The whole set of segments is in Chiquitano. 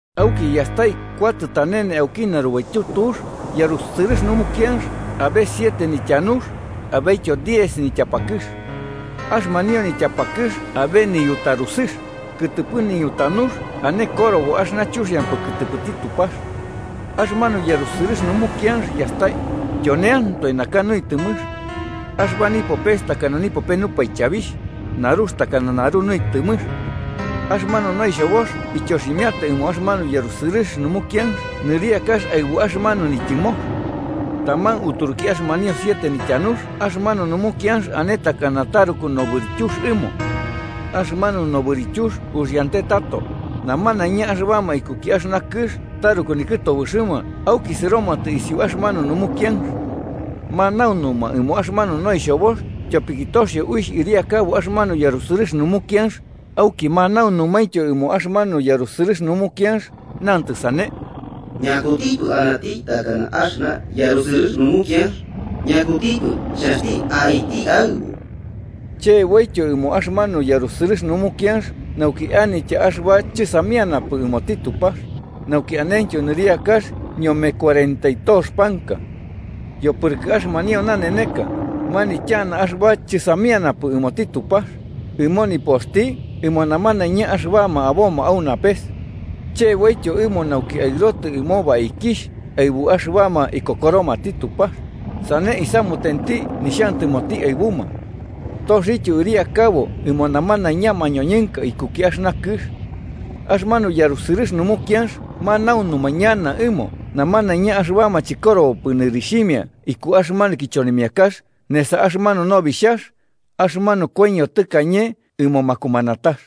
Auki yastai kuatɨ tanene auki narubaityu tux yarusɨrɨx numukianx abe siete nityanux abetyo diez nityapakɨx. Axɨmanio nityapakɨx abe niyutarusɨx, kɨtɨpɨ niñutanux ane korobo axɨna chuxiampɨ kɨtɨpɨti Tupax. Axɨmanu yarusɨrɨx numukianx yastai, tyoneantoe naka nuitɨmɨx. Axɨba nipopes takana nipope nupaichabixh, narux takana naru nuitɨmɨx. Axɨmanu noixhobox ityoximiata ɨmo axɨmanu yarusɨrɨx numukianx nɨriakax aɨbu axɨmanu nityɨmox. Taman uturuki axɨmanio siete nityanux axɨmanu numukianx ane takana taruku nobɨrityux ɨmo. Axɨmanu nobɨrityux uxiante tato, namanaiña axɨbama ikuki axɨna kɨx taruku nikɨtobɨxɨma auki sɨromatɨ isiu axɨmanu numukianx. Manaunuma ɨmo axɨmanu noixhobox tyopiki toxio uixh ɨriakabo axɨmanu yarusɨrɨx numukianx, auki manaunumaintyo ɨmo axɨmanu yarusɨrɨx numukianx, namatɨ sane: “¿Ñakutipɨ anati takana axɨna yarusɨrɨx numukianx, ñakutipɨ xhanxti aiti aɨbu?” Cheboityo ɨmo axɨmanu yarusɨrɨx numukianx nauki anitya axɨba chɨsamianapɨ ɨmoti Tupax, nauki anentyo nɨriakax ñome kuarenta y tox panka. Yopɨrɨkɨ axɨmanio naneneka, manityana axɨba chɨsamianapɨ ɨmoti Tupax, ɨmo nipoxti ɨmo namanaiña axɨbama aboma au napes. Cheboityo ɨmo nauki aɨrotɨ ɨmo baikixh aɨbuma axɨbama ikokoromati Tupax, sane isamutenti nixhantɨmoti aɨbuma. Toxioityo ɨriakabo ɨmo namanaiña mañoñɨnka ikuki axɨna kɨx. Axɨmanu yarusɨrɨx numukianx manaunuma ñana ɨmo namanaiña axɨbama chɨkorobopɨ nɨrixhimia iku axɨmanu kichonimiakax nesa axɨmanu Nobixhax, axɨmanu koiño tɨkañe ɨmo makumanatax.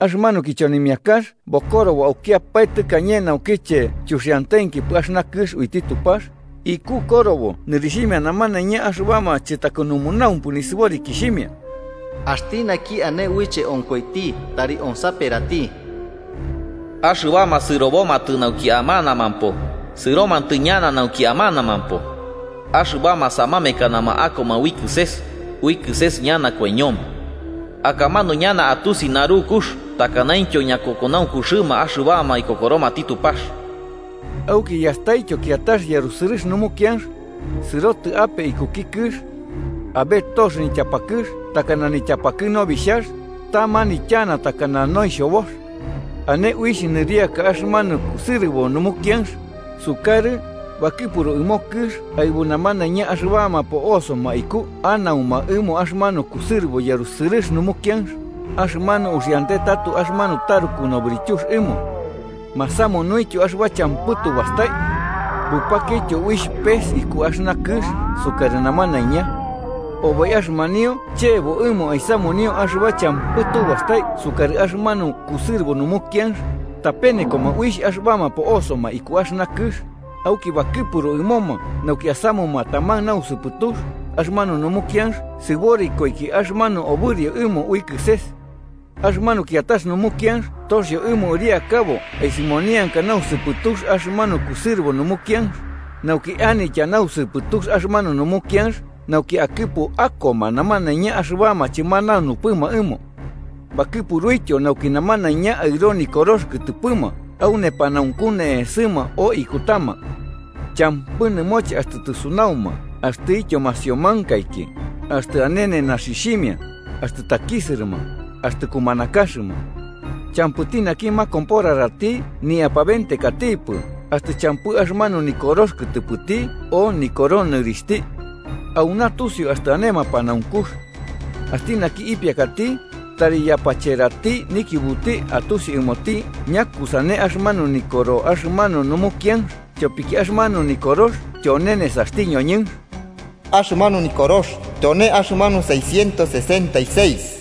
Axɨmanu kichonimiakax bokorobo aukiapae tɨkañe naukiche chuxiantenkipɨ axɨna kɨx uiti Tupax, iku korobo nɨrixhimia namanaiña axɨbama chɨtakɨnunaumpɨ nisɨborikixhimia. Axti naki ane uiche onkoiti tari onsaperati: “Axɨbama sɨrobomatɨ nauki amanamampo, sɨromatɨ ñana nauki amanamampo. Axɨbama samamekanama akoma ui kɨses, ui kɨses ñana koiñoma.” Akamanu ñana atusi narukux takanaintyo ñakokonaunkuxɨma axɨbama ikokoromati Tupax. Auki yastaityo kiatax yarusɨrɨx numukianx, sɨrotɨ ape ikuki kɨx. Abe tox nityapakɨx takana nityapakɨ nobixhax, ta manityana takana noixhobox. Ane uixh nɨriaka axɨmanu kusɨrɨbo numukianx, sukarɨ, bakɨpuru ɨmo kɨx aɨbu namanaiña axɨbama po'osoma iku anauma ɨmo axɨmanu kusɨrɨbo yarusɨrɨx numukianx, axɨmanu uxiante tato axɨmanu taruku nobɨrityux ɨmo. Masamunuityo axɨba champɨ tu bastai. Bupakioityo uixh pes iku axɨna kɨx sukarɨ namanaiña. Oboi axɨmanio chebo ɨmo aisamunio axɨba champɨ tu bastai sukarɨ axɨmanu kusɨrɨbo numukianx, tapenekoma uixh axɨbama po'osoma iku axɨna kɨx, auki bakɨpuru ɨmoma nauki asamuma taman nausɨpɨtux axɨmanu numukianx sɨborikoiki axɨmanu obɨrio ɨmo ui kɨses. Axɨmanu kiatax numukianx toxio ɨmo ɨriakabo aisɨmonianka nausɨpɨtux axɨmanu kusɨrɨbo numukianx, nauki anitya nausɨpɨtux axɨmanu numukianx nauki akɨpu akoma namanaiña axɨbama chɨmanaunupɨma ɨmo. Bakɨpuruityo nauki namanaiña aɨro nikorox kɨtɨpɨma au nepanaunku ne'esɨma o ikutama. Champɨ nɨmoche axtɨ tɨsunauma axtɨtyo masiomankaiki, axtɨ ane nenaxixhimia, axtɨ takisɨrɨma, axtɨ kumanakaxɨma. Champɨti naki makomporarati nipɨ apabentekati axtɨ champɨ axɨmanu nikorox kɨtɨpɨti o nikoro nɨrixhti. Auna tusiu axtɨ ane mapanaunkux. Axti naki ipiakati, tari yapacherati nikiubuti atusi ɨmoti ñakusane axɨmanu nikoro axɨmanu numukianx, tyopiki axɨmanu nikorox tyone nesaxti ñoñɨnx. Axɨmanu nikorox tyone axɨmanu Seiscientos sesenta y seis.